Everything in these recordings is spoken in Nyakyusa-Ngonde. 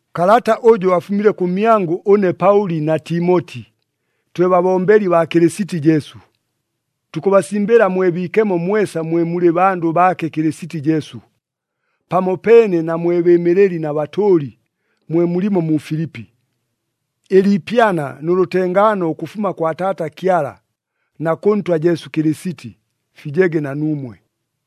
Kalata ʉjʉ afumile kʉmyangʉ ʉne Paʉli na Timoti, twe babombeli baa Kɨlɨsiti Jesu. Tukʉbasimbɨla mwe biikemo mwesa mwe mulɨ bandʉ baake Kɨlɨsiti Jesu, pamopeene na mwe bɨɨmɨlɨli na batʉʉli, mwe mulimo mu Filipi. Ɨliipyana nʉ lʉtengaano ʉkʉfuma kwa Taata Kyala na kʉ Ntwa Jesu Kɨlɨsiti, fijege na nuumwe.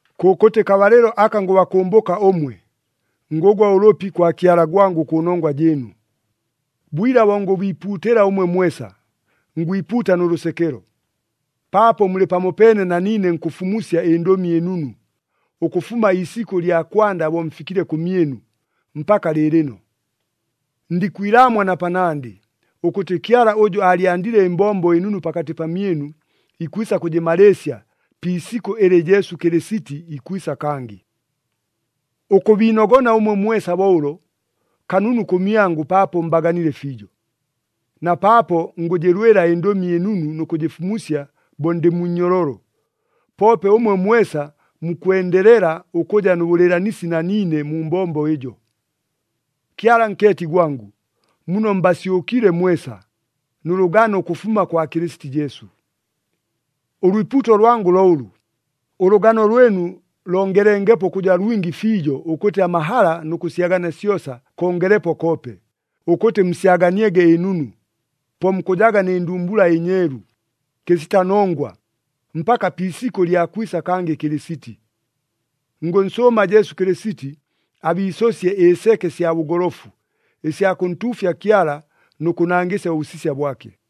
Kʉkʉtɨ kabalɨlo aka ngʉbakʉmbʉka ʉmwe, ngʉgwa ʉlʉpi kwa Kyala gwangʉ kʉnongwa jɨɨnu. Bwila bo ngʉbiipuutɨla ʉmwe mwesa, ngwipuuta nʉ lʉsekelo, paapo mulɨ pamopeene na niine nkʉfumusya ɨNdʉmi ɨNunu, ʉkʉfuma iisikʉ lya kwanda bo mfikile kʉmyɨnu, mpaka lɨɨlɨno. Ndikwilaamwa na panandɨ, ʉkʉtɨ Kyala ʉjʉ aalyandile ɨmbombo ɨnunu pakatɨ pamyɨnu, ikwisa kʉjɨmalɨɨsya pi isikʉ ɨlɨ Jesu Kɨlɨsiti ikwisa kangɨ. Ʉkʉbiinogona ʉmwe mwesa bo ʉlo, kanunu kʉmyangʉ paapo mbaganile fiijo. Na paapo ngʉjɨlwɨla ɨNdʉmi ɨNunu nʉ kʉjɨfumusya bo ndɨ mu nnyololo, poope ʉmwe mwesa mukwendelela ʉkʉja nʉ bʉlɨɨlanisi na niine mu mbombo ɨjo. Kyala nkeeti gwangʉ, muno mbasyʉkile mwesa, nʉ lʉgano ʉkʉfuma kwa Kɨlɨsiti Jesu. Ʉlwipuuto lwangʉ lo ʉlʉ, ʉlʉgano lwɨnu longelengepo ʉkʉja lwingi fiijo ʉkʉtɨ amahala nʉ kʉsyagania syosa kongelepo koope, ʉkʉtɨ musyaganiege ɨnunu. Po mukʉjaga nɨ ndumbula ɨnyeelu, kɨsita nongwa, mpaka pi isikʉ lya kwisa kangɨ Kɨlɨsiti. Ngʉnsʉʉma Jesu Kɨlɨsiti abiisʉsye ɨseke sya bʉgolofu, ɨsya kʉntuufya Kyala nʉ kʉnangɨsya ʉbʉsisya bwake.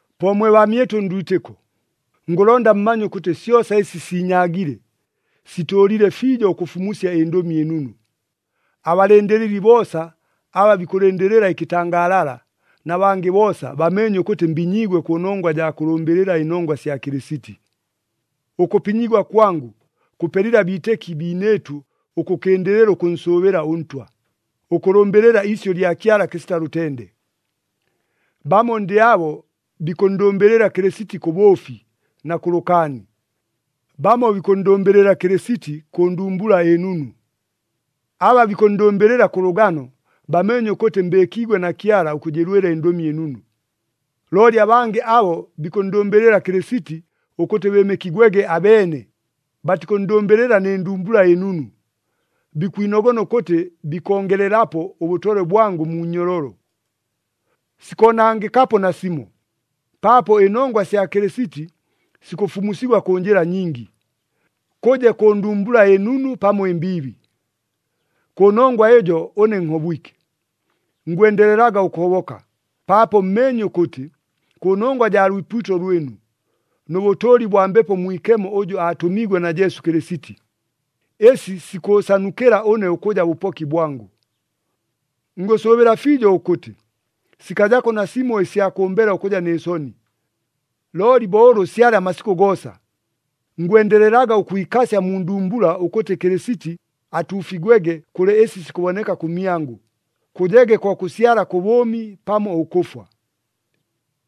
Po mwe baamyɨtʉ ndwitɨko, ngʉlonda mumanye ʉkʉtɨ syosa ɨsi siinyaagile, sitʉʉlile fiijo ʉkʉfumusya ɨNdʉmi ɨNunu. Abalɨndɨlɨli boosa aba bikʉlɨndɨlɨla ɨkɨtangaalala, na bangɨ boosa bameenye ʉkʉtɨ mbinyiigwe kʉnongwa jaa kʉlʉmbɨlɨla ɨnongwa sya Kɨlɨsiti. Ʉkʉpinyigwa kwangʉ, kʉpelile abiitɨki biinɨɨtʉ ʉkʉkɨndɨlɨla ʉkʉnsʉʉbɨla ʉNtwa, ʉkʉlʉmbɨlɨla iisyʉ lya Kyala kɨsita lʉtende. Bamo ndɨ abo bikʉnndʉmbɨlɨla Kɨlɨsiti kʉ bʉʉfi na kʉ lʉkaani, bamo bikʉnndʉmbɨlɨla Kɨlɨsiti kʉ ndumbula ɨnunu. Aba bikʉnndʉmbɨlɨla kʉ lʉgano, bameenye ʉkʉtɨ mbɨɨkiigwe na Kyala ʉkʉjɨlwɨla ɨNdʉmi ɨNunu. Looli abangɨ abo bikʉnndʉmbɨlɨla Kɨlɨsiti ʉkʉtɨ bɨɨmɨkigwege abeene, batikʉnndʉmbɨlɨla nɨ ndumbula ɨnunu. Bikwinogona ʉkʉtɨ bikongelelapo ʉbʉtolwe bwangʉ mu nnyololo. Sikoonangɨkapo nasimo, paapo ɨnongwa sya Kɨlɨsiti sikʉfumusigwa kʉ njɨla nyingi, kʉje kʉ ndumbula ɨnunu pamo ɨmbiibi. Kʉnongwa ɨjo ʉne nhobwike. Ngwendelelaga ʉkʉhoboka, paapo mmeenye ʉkʉtɨ, kʉnongwa jaa lwipuuto lwɨnu, nʉ bʉtʉʉli bwa Mbepo Mwikemo ʉjʉ aatʉmiigwe na Jesu Kɨlɨsiti, ɨsi sikʉʉsanukɨla ʉne ʉkʉja bʉpoki bwangʉ. Ngʉsʉʉbɨla fiijo ʉkʉtɨ, sikajako nasimo ɨsya kʉmbela ʉkʉja nɨ soni, looli bo ʉlʉ syalɨ amasikʉ goosa, ngwendelelaga ʉkwikasya mu ndumbula ʉkʉtɨ Kɨlɨsiti atuufigwege kʉlɨ ɨsi sikʉboneka kʉmyangʉ, kʉjege ko kʉsyala kʉ bʉʉmi pamo ʉkʉfwa.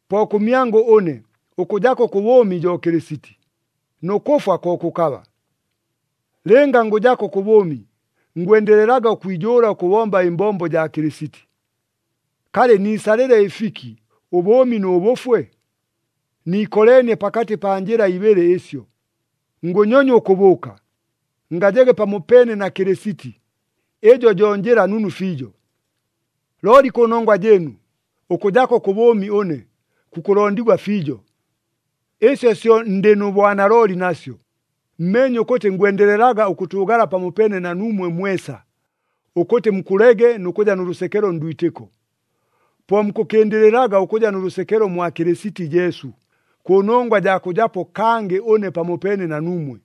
Po kʉmyangʉ ʉne, ʉkʉjako kʉ bʉʉmi jo Kɨlɨsiti, nʉ kʉfwa ko kʉkaba. Lɨnga ngʉjako kʉ bʉʉmi, ngwendelelaga ʉkwijʉʉla ʉkʉbomba ɨmbombo jaa Kɨlɨsiti. Kalɨ niisalɨle ɨfiki ʉbʉʉmi nʉ bʉfwe? Niikoleenie pakatɨ pa njɨla ibɨlɨ ɨsyo. Ngʉnyonywa ʉkʉbʉʉka, ngajege pamopeene na Kɨlɨsiti, ɨjo jo njɨla nunu fiijo. Looli kʉnongwa jɨɨnu, ʉkʉjako kʉ bʉʉmi ʉne, kukʉlondigwa fiijo. Ɨsyo syo ndɨ nʉ bwanalooli nasyo, mmeenye ʉkʉtɨ ngwendelelaga ʉkʉtʉʉgala pamopeene na nuumwe mwesa, ʉkʉtɨ mukʉlege nʉ kʉja nʉ lʉsekelo ndwitɨko. Po mukʉkɨndɨlɨlaga ʉkʉja nʉ lʉsekelo mwa Kɨlɨsiti Jesu, kʉnongwa jaa kʉjapo kangɨ ʉne pamopeene na nuumwe.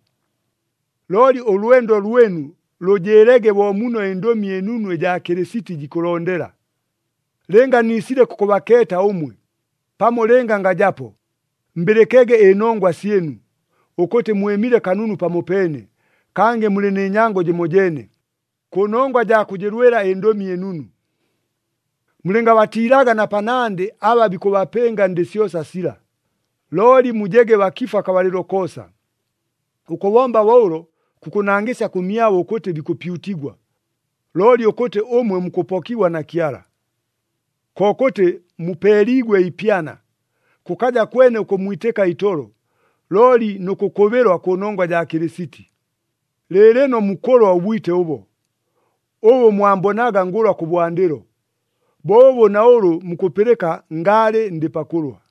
Looli ʉlwendo lwɨnu lʉjɨɨlege bo muno ɨNdʉmi ɨNunu ɨjaa Kɨlɨsiti jikʉlondela. Lɨnga niisile kʉkʉbakeeta ʉmwe, pamo lɨnga ngajapo, mbɨlɨkege ɨnongwa syɨnu, ʉkʉtɨ mwɨmile kanunu pamopeene, kangɨ mulɨ nɨ nyango jɨmojeene, kʉnongwa jaa kʉjɨlwɨla ɨNdʉmi ɨNunu. Mulɨngabatiilaga na panandɨ aba bikʉbapɨnga ndɨ syosa sila, looli mujege bakifu akabalɨlo koosa. Ʉkʉbomba bo ʉlo kukʉnangɨsyaga kʉmyabo ʉkʉtɨ bikʉpyutigwa, looli ʉkʉtɨ ʉmwe mukʉpokigwa na Kyala. Kokʉtɨ mupeeliigwe ipyana, kʉkaja kwene ʉkʉmmwitɨka itolo, looli nʉ kʉkʉbɨlwa kʉnongwa jaa Kɨlɨsiti. Lɨɨlɨno mukʉlwa ʉbwite ʉbo, ʉbʉ mwambonaga ngʉlwa kʉbwandɨlo, bo ʉbʉ na ʉlʉ mukʉpɨlɨka ngaalɨ ndɨ pakʉlwa.